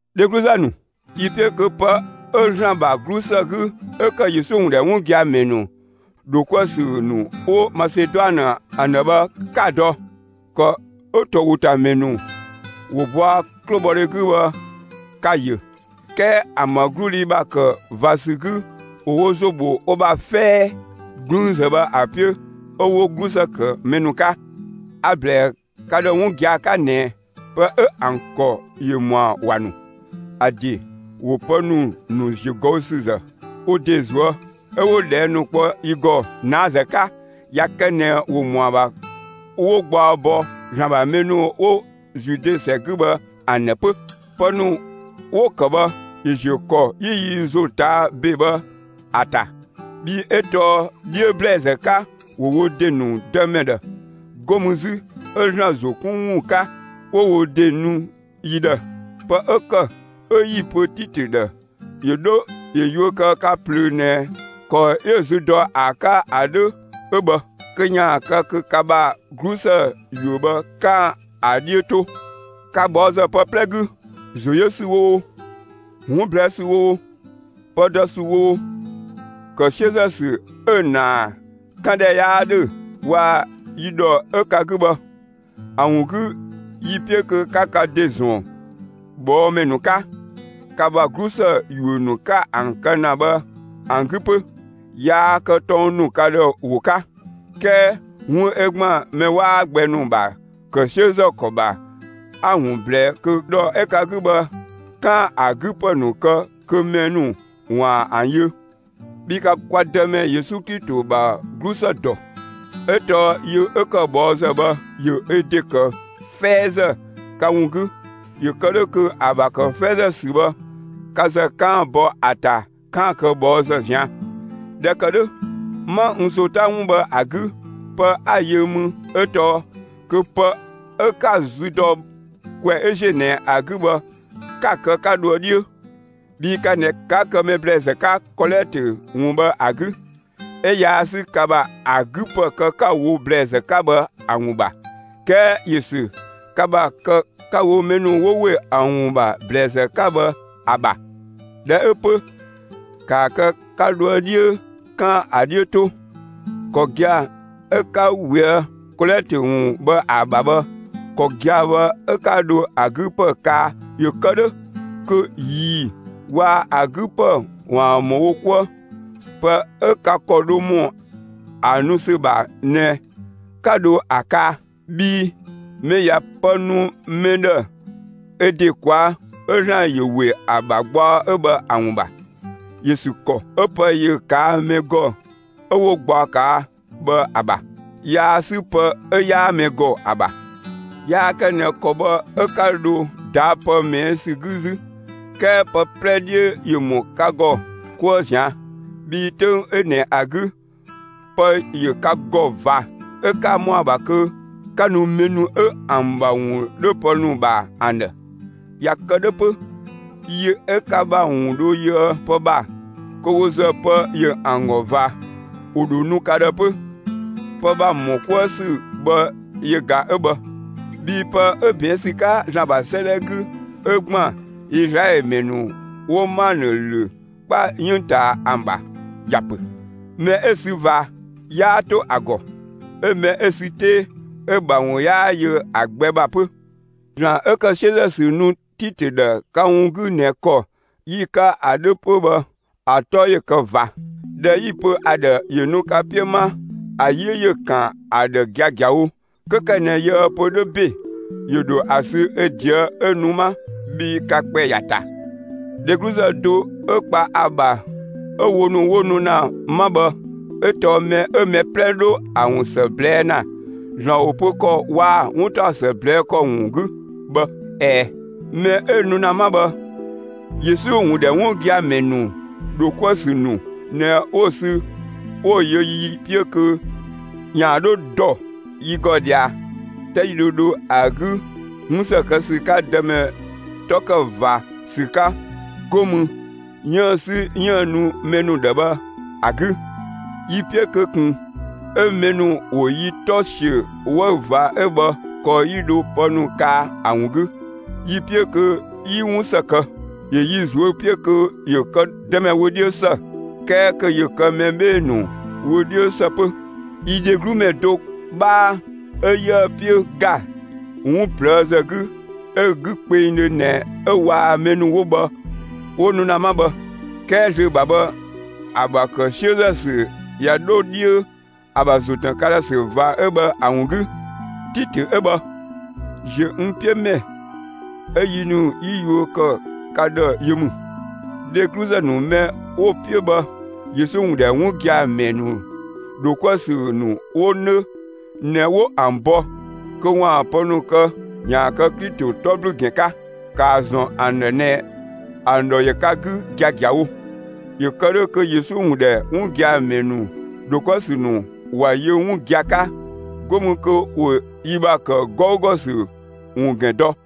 Dhegluzë ‑nu, yi‑ 'piö kö pë 'ö ‑Zlan ‑bha 'glusë 'gü 'ö‑ ‑kë Yesu ‑wun ‑dhɛ 'wun gia‑ ‑mɛ ‑nu ‑dho 'kuë‑ ‑sü ‑nu 'wo Maseduanë ‑an ‑dhë bhë 'ka‑ dɔ. ‑Kɔ 'ö ‑towotamɛ ‑nu ‑wo bɔa 'klobhɔdhe 'gü bhë ka‑ ‑yö; 'kɛɛ ‑an ‑bha 'gludhi ‑bha ‑kë ꞊va ‑sü 'gü ‑wo wo ‑zo ‑bho wo ‑bha 'fɛɛ 'gblüünzë bhë ‑a 'piö 'ö 'wo 'glusë ‑kë mɛ ‑nu 'ka. A‑ ꞊blɛɛ ka ‑dhë 'wun gia‑ 'ka ꞊nɛ pë 'ö ‑an ‑kɔ ‑yö ‑mɔa ‑wa ‑nu. ‑A ‑de ‑wo pë ‑nu ‑nu ‑ziögɔüsüzë wo ‑de ꞊zuë'. 'Ö 'wo ꞊dhɛɛ' ‑nu kpɔ yi ‑gɔ ꞊naazë 'ka ꞊ya kë ꞊nɛ ‑wo ‑mɔa ‑bha 'wo gbaɔ bɔ ‑Zlan ‑bha mɛ ‑nu 'wo Zude ‑sɛ 'gü bhë ‑an ‑dhë 'pö. Pë ‑nu 'wo‑ ‑kë bhë ‑yö ‑ziö ‑kɔ 'yi yi ‑zo ꞊taa' ‑be bhë ‑a ‑ta. Bhii 'ö tɔɔ 'dhiö ‑blɛɛzë 'ka ‑wo wo ‑de ‑nu Dëmɛ ‑dhë; 'go mü 'zü, 'ö ‑Zlan ‑zo 'kun ‑wun 'ka, 'wo wo ‑de nu yi ‑dhë. Pë 'ö ‑kë 'ö 'yi‑ pö Titö ‑dhë ‑yö 'dho ‑yö yuö kë ka ꞊plöö ꞊nɛ ‑kɔ 'yö‑ zü dɔ ‑a 'ka ‑a 'dhö 'ö bhë kö ‑yaan kë kö ka ‑bha 'glusë ‑yuö bhë, 'kaan‑ ‑a 'dhiö 'to. Ka ꞊bhɔɔzë pë 'plɛ 'gü: ‑Zo yö ‑sü oo, 'wun ꞊blɛɛ' ‑sü oo, pë dɔ ‑sü oo, ‑kë 'siözë ‑sü 'ö‑ ‑naa 'kan ‑dhɛ 'yaa ‑dhö waa‑ yi ‑dhɔ 'ö ka 'gü bhë; ‑a ‑wun 'gü yi‑ 'piö kö 'ka ka ‑de ‑zɔn ꞊bhɔɔmɛ ‑nu 'ka, ka ‑bha 'glusë ‑yuö ‑nu 'ka ‑an kë ‑na bhë ‑an 'gü 'pö. Yaa kë tɔng ‑nu ka ‑dhë ‑wo 'ka; 'kɛɛ 'wun 'ö ‑gban mɛ 'waa gbɛ ‑nu ‑bha ‑kë 'siözë ‑kɔ ‑bha 'a‑ ‑wun ꞊blɛɛ kö ‑dhɔ 'ö ka 'gü bhë, 'kaan‑ ‑a 'gü ‑pë ‑nu kë, kö mɛ ‑nu ‑waan ‑an yö. Bhii ka kwa Dëmɛ Yesu Klito ‑bha 'glusë ‑dɔ! 'Ö tɔɔ yö 'ö ‑kë ꞊bhɔɔzë bhë ‑yö ö ‑de ‑kë 'fɛɛzë ka ‑wun 'gü, ‑yö kë 'dhö kö ‑a ‑bha ‑kë 'fɛɛzë ‑sü bhë, ka ‑zë 'kaan‑ bɔ ‑a ‑ta 'kaan‑ kë ꞊bhɔɔzë ꞊zian'. ꞊Dhɛ ‑kë 'dhö, 'ma n ‑zo 'ta 'wun bhë ‑a 'gü; pë 'a‑ yö mü 'ö tɔɔ kö pë 'ö 'ka‑ zü dɔ ‑kwɛ 'ö ‑ziö ꞊nɛ ‑a 'gü bhë 'ka‑ kë 'ka dhoë 'dhiö, bhii ka ꞊nɛ 'ka ‑kë mɛ ‑blɛɛzë ‑nu 'ka kɔlɛtö ‑wun bhë ‑a 'gü; 'ö yaa 'sü ka ‑bha ‑a 'gü ‑pë kë 'ka‑ wo ‑blɛɛzë 'ka bhë ‑a ‑wun ‑bha. 'Kɛɛ ‑yö ‑sü ka ‑bha kë 'ka‑ wo mɛ ‑nu 'wo ‑we ‑a ‑wun ‑bha ‑blɛɛzë 'ka bhë ‑a ‑bha. ꞊Dhɛ 'ö 'pö, ‑kaa kë 'ka dhoë 'dhiö 'kaan‑ ‑a 'dhiö 'to. ‑Kɔ gia‑ 'ö 'ka ꞊weë' kɔlɛtö ‑wun bhë ‑a ‑bha bhë, ‑kɔ gia‑ bhë 'ö 'ka dho ‑a 'gü ‑pë kaa ‑yö kë 'dhö kö ꞊ii‑ waa‑ ö 'gü ‑pë ‑waan ‑mɔ wo 'kuë. Pë 'ö ka ‑kɔ dho ‑mɔ ‑a nu ‑sü ‑bha ꞊nɛ 'ka dho ‑a kaa. Bhii mɛ ꞊ya pë nu mɛ ‑dhë ö ‑de ꞊kwaa', 'ö ‑Zlan ‑yö ‑we ‑a ‑bha gbaɔ 'ö bhë ‑a ‑wun ‑bha. ‑Yö ‑sü ‑kɔ 'ö pë ‑yö ꞊kaa' mɛ ‑gɔ 'ö 'wo gbaɔ ꞊kaa' bhë ‑a ‑bha. Yaa 'sü pë 'ö 'yaa mɛ ‑gɔ ‑a ‑bha. Yaa kë ꞊nɛ ‑kɔ bhë 'ö 'ka dho ꞊daa' pë ꞊mɛɛ' ‑sü 'gü 'zü, 'kɛɛ pë 'plɛ 'dhiö ‑yö ‑mɔ ka ‑gɔ 'kuë ꞊zian'. Bhii 'töng 'ö ꞊nɛ ‑a 'gü, pë ‑yö ka ‑gɔ ꞊va, 'ö 'ka ‑mɔa ‑bha kö 'ka nu mɛ ‑nu 'ö ‑an ‑bha ‑wun 'dho pë ‑nu ‑bha ‑an ‑dhë. ꞊Ya kë 'dhö 'pö, yi 'ö ka ‑bha ‑wun dho yöë pë ‑bha, kö wo ‑zë pë ‑yö ‑an ‑gɔ ꞊va, ‑wo ‑dho nu ka ‑dhë 'pö. Pë ‑bha ‑mɔ 'kuë ‑sü bhë yö ꞊ga 'ö bhë. Bhii pë 'ö ꞊bɛɛn' ‑sü 'ka ‑Zlan ‑bha 'sëëdhɛ 'gü ('ö ‑gban Izlaɛlö ‑mɛ ‑nu 'wo 'manë ‑lö 'kpa 'yënng ꞊taa ‑an ‑bha,) ‑ya ‑pö: Mɛ 'ö‑ sü ꞊va 'yaa 'to ‑a ‑gɔ; 'ö mɛ 'ö‑ sü 'tee 'ö‑ ‑bha ‑wun 'yaa yö ‑a gbɛ ‑bha 'pö. ‑Zlan 'ö ‑kë 'siözë ‑sü nu Titö ‑dhë ka ‑wun 'gü ꞊nɛ ‑kɔ 'yi‑ 'ka ‑a 'dhö 'pö bhë ‑a 'tɔ ‑yö kë ꞊va! ꞊Dhɛ 'yi‑ pö ‑a ‑dhë ‑yö nu ka 'piö 'ma, ‑a 'yi ‑yö ‑kan ‑a ‑dhë giagiawo; 'kö ‑kë ꞊nɛ yië‑ pö 'dhö ‑be, ‑yö ‑dho ‑a sü ö ꞊deë' 'ö nu 'ma bhii ka ‑kpɛ ‑ya ‑ta. Dhegluzë do 'ö kpa ‑a ‑bha 'ö wo ‑nu 'wo nu ‑na 'ma bhë 'ö tɔɔ mɛ 'ö mɛ 'plɛ 'dho ‑a ‑wun ‑së ꞊blɛɛ' ‑na ‑Zlan ‑wo pö ‑kɔ waa‑ 'wuntaɔsë ꞊blɛɛ' ‑kɔ ‑wun 'gü bhë. ꞊Ɛɛ, mɛ 'ö nu ‑na 'ma bhë, Yesu ‑wun ‑dhɛ 'wun gia‑ ‑mɛ ‑nu ‑dho 'kuë‑ ‑sü ‑nu ꞊nɛ 'wo‑ sü 'wo‑ yö yi 'piö kö ‑yaan 'dho ‑dɔ yi ‑gɔ ꞊dhia, 'ta 'yi dho dho ‑a 'gü 'wun ‑së kë ‑sü 'ka Dëmɛ 'tɔ ‑kë ꞊va ‑sü 'ka, 'go mü 'yiën‑ 'sü 'yiën‑ nu mɛ ‑nu ‑dhë bhë ‑a 'gü. Yi‑ 'piö kö ꞊kun 'ö mɛ ‑nu ‑wo yi 'tɔ ‑siö 'wëü‑ ꞊va 'ö bhë ‑kɔ 'yi dho pë ‑nu kaa ‑a ‑wun 'gü. Yi‑ 'piö kö 'yi 'wun ‑së kë; ‑yö yi ꞊zuö' 'piö kö ‑yö kë Dëmɛ wö 'dhiö ‑së, 'kɛɛ kö ‑yö kë mɛ 'bhee‑ ‑nu wö 'dhiö ‑së 'pö. Yi dheglu ‑mɛ do 'bhaa 'ö 'yië‑ 'piö ‑ga 'wun ꞊plëëzë 'gü 'ö‑ 'gü kpengdhö ꞊nɛ 'ö waa‑ mɛ ‑nu 'wo bhë 'wo nu ‑na 'ma bhë. 'Kɛɛ zlöö ‑bha bhë ‑a ‑bha ‑kë 'siözë ‑sü ꞊ya 'dho 'dhiö ‑a ‑bha ‑zo ‑tën ka ‑dhë ‑sü ꞊va 'ö bhë ‑a ‑wun 'gü. Titö 'ö bhë, ‑ziö n 'piö ‑mɛ 'ö yi ‑nu 'yi yuö ‑kë ka ‑dhë yö ‑mü; dhegluzë ‑nu mɛ 'wo‑ 'piö bhë, Yesu ‑wun ‑dhɛ 'wun gia‑ ‑mɛ ‑nu ‑dho 'kuë‑ ‑sü ‑nu 'wo 'nö ꞊nɛ 'wo ‑an bɔ kö ‑waan pë ‑nu kë ‑yaan kë Klito 'tɔ ‑blü ‑gɛn 'ka. ‑Kaa ‑zɔn ‑an ‑dhë ꞊nɛ ‑an ‑dhɔ ‑yö ka 'gü giagiawo, ‑yö kë 'dhö kö Yesu ‑wun ‑dhɛ 'wun gia‑ ‑mɛ ‑nu ‑dho 'kuë‑ ‑sü ‑nu ‑wa yö 'wun gia‑ 'ka, 'go mü kö ‑wo yi ‑bha ‑kë 'gɔugɔ ‑sü ‑wun ‑gɛn dɔ.